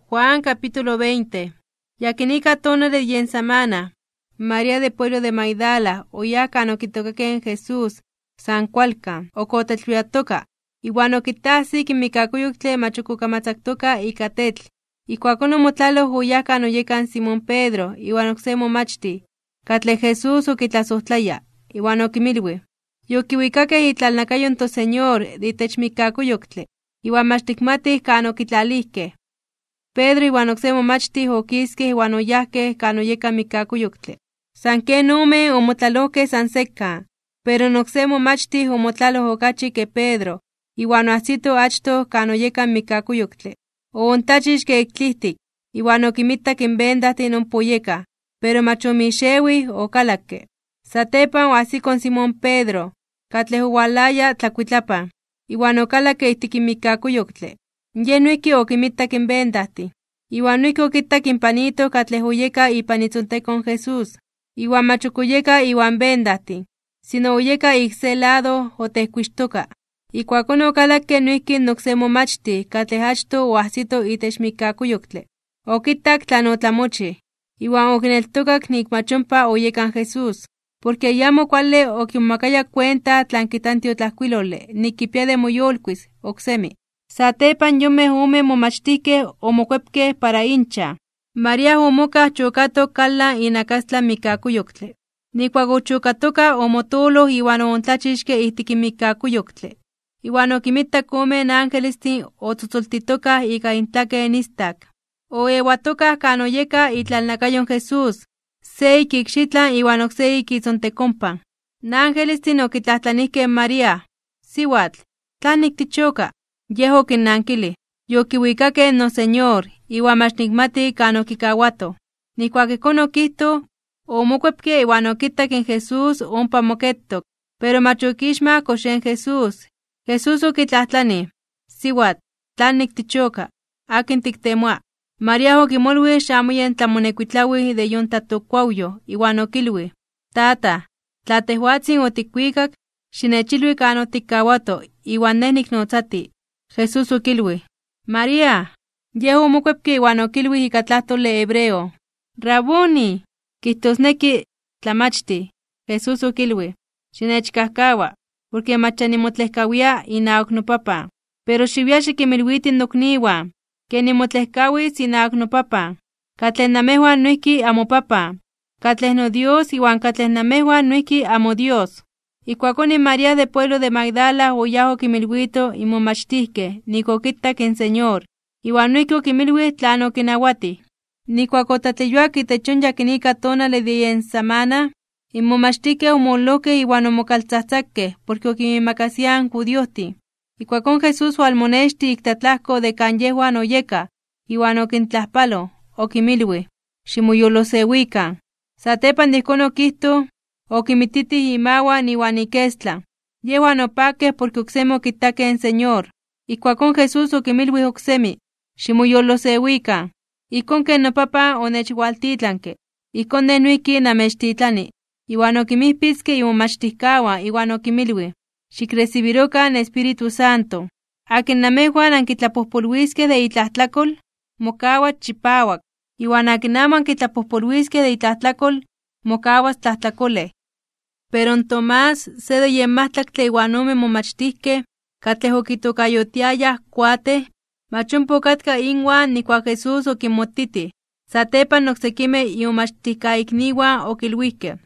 In yakinika tonale de yen samana, in María de pueblo de Magdala oyáj kan okitookakej in Jesús san kualkan, ok otlatleyuatoka. Iwan okitajsik in mikkakuyoktle mach ok okamatzaktoka ika tetl. Ijkuakón omotlaloj oyáj kan oyeka in Simón Pedro iwan oksé momachtij, katlej Jesús okitlasojtlaya, iwan okinmilwij: ―¡Yokiwikakej itlalnakayo in toSeñor de itech mikkakuyoktle, iwan mach tikmatij kan okitlalijkej! Pedro iwan oksé momachtij okiskej iwan oyajkej kan oyeka in mikkakuyoktle. San ken omen omotlalojkej san sekan, pero in oksé momachtij omotlaloj okachi ke Pedro iwan oajsito achtoj kan oyeka in mikkakuyoktle. Oontlachixke ik tlijtik, iwan okinmitak in bendajtin ompa oyekaj, pero mach omixewij okalakke. Satepan oajsiko in Simón Pedro, katlej owalaya tlakuitlapan, iwan okalakke ijtik in mikkakuyoktle. Yej noijki okinmitak in bendajtin. Iwan noijki okitak in panito katlej oyeka ipan itzontekon in Jesús, iwan mach oyeka iwan bendajtin, sino oyeka ik se lado otejkuixtoka. Ijkuakón okalakke noijki in oksé momachtij katlej achtoj oajsito itech mikkakuyoktle. Okitak tlan otlamochij, iwan okineltokak nik mach ompa oyeka in Jesús. Porke ayamo kuale okimomakayaj kuenta tlan kijta in tiotlajkuilole nik kipia de moyolkuis (moyolitis) oksemi. Satepan in yonmej omen momachtijkej omokuepkej para inchan. María omokaj chokatok kalan inakastlan mikkakuyoktle. Nijkuak ochokatoka omotooloj iwan oontlachixke ijtik in mikkakuyoktle. Iwan okinmitak omen angelestin otzotzoltitokaj ika intlaken istak. Oewatokaj kan oyeka itlalnakayo in Jesús, se ik ikxitlan iwan oksé ik itzontekonpan. In angelestin okitlajtlanijkej in María: ―Siwatl, ¿tlanik tichoka? Yej okinnankilij: ―Yokiwikakej noSeñor, iwan mach nikmati kan okikawatoj. Nijkuak ijkón okijtoj, omokuepke iwan okitak in Jesús ompa moketok, pero mach okixmaj kox yen Jesús. Jesús okitlajtlanij: ―Siwatl, ¿tlanik tichoka? ¿Akin tiktemoa? María okimolwij xamo yen tlamonekuitlawij de yon tlatokkuawyoj, iwan okilwij: ―Tataj, tla tejwatzin otikwikak, xinechilwi kan otikkawato, iwan nej niknotzatij. Jesús okilwij: ―¡María! Yej omokuepke iwan okilwij ika tlajtole hebreo: ―¡Raboni! ―kijtosneki Tlamachtij. Jesús okilwij: ―Xinechkajkawa, porke mach ya nimotlejkawia (nitlejko) inawak noPapan. Pero xiwia xikinmilwiti nokniwan, ke nimotlejkawis inawak noPapan, katlej namejwan noijki amoPapan, katlej noDios iwan katlej namejwan noijki amoDios. Ijkuakón in María de pueblo de Magdala oyáj okinmilwito in momachtijkej nik okitak in Señor, iwan noijki okinmilwij tlan okinawatij. Nijkuak otlatleyuak itech yon yakinika tonale de yen samana, in momachtijkej omololojkej iwan omokaltzajtzakej porke okinmiimakasiaj in judiojtin. Ijkuakón Jesús owalmonextij ik tlatlajko de kan yejwan oyekaj iwan okintlajpaloj, okinmilwij: ―Ximoyolosewikan. Satepan de ijkón okijtoj, okinmititij imawan iwan ikestlan. Yejwan opakej porke oksemi okitakej in Señor. Ijkuakón Jesús okinmilwij oksemi: ―Ximoyolosewikan. Ijkón ken noPapan onechwaltitlanke, ijkón Nej noijki namechtitlani. Iwan okinmijpitzke imomachtijkawan, iwan okinmilwij: ―Xikresibirokan in Espíritu Santo. Akin namejwan ankitlapojpolwiskej de itlajtlakol, mokawas chipawak. Iwan akin amo ankitlapojpolwiskej de itlajtlakol, mokawas tlajtlakolej. Pero in Tomás, se de yen majtlaktle iwan omen momachtijkej, katlej okitokayotiayaj Kuatej, mach ompa okatka inwan nijkuak in Jesús okinmotitij. Satepan in oksekimej imomachtijkaikniwan okilwijkej: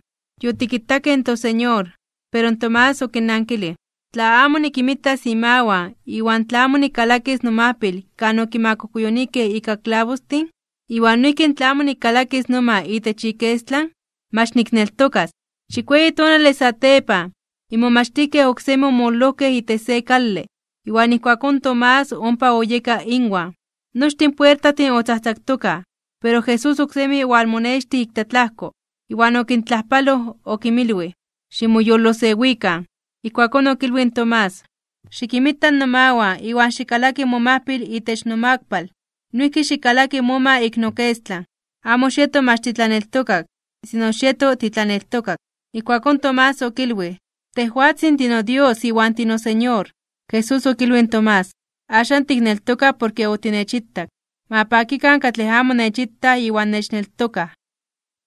―Yotikitakej in toSeñor. Pero in Tomás okinnankilij: ―Tla amo nikinmitas imawan iwan tla amo nikkalakis nomajpil kan okimakujkuyunijkej ika klabostin, iwan noijki tla amo nikkalakis noma itech ikestlan, mach nikneltokas. Chikueyi tonale satepan, in momachtijkej oksemi omololojkej itech se kale, iwan ijkuakón in Tomás ompa oyeka inwan. Nochtin in puertajtin otzajtzaktokaj, pero Jesús oksemi owalmonextij ik tlatlajko. Iwan okintlajpaloj okinmilwij: ―Ximoyolosewikan. Ijkuakón okilwij in Tomás: ―Xikinmita nomawan iwan xikkalaki momajpil itech nomakpal. Noijki xikkalaki moma ik nokestlan. Amo xieto mach titlaneltokak, sino xieto titlaneltokak. Ijkuakón Tomás okilwij: ―¡Tejwatzin tinoDios iwan tinoSeñor! Jesús okilwij in Tomás: ―Axan tikneltoka porke otinechitak. Ma pakikan katlej amo nechitaj iwan nechneltokaj.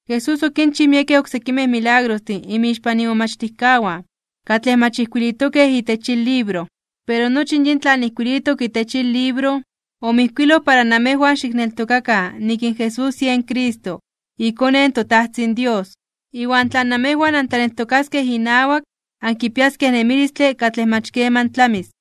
Jesús okinchij miekej oksekimej milagrostin inmixpan imomachtijkawan, katlej mach ijkuilitokej itech yin libro. Pero nochi yin tlan ijkuilitok itech yin libro, omijkuiloj para namejwan xikneltokakan nik in Jesús yen Cristo, iKone in toTajtzin Dios. Iwan tla namejwan antlaneltokaskej inawak ankipiaskej nemilistle katlej mach keman tlamis.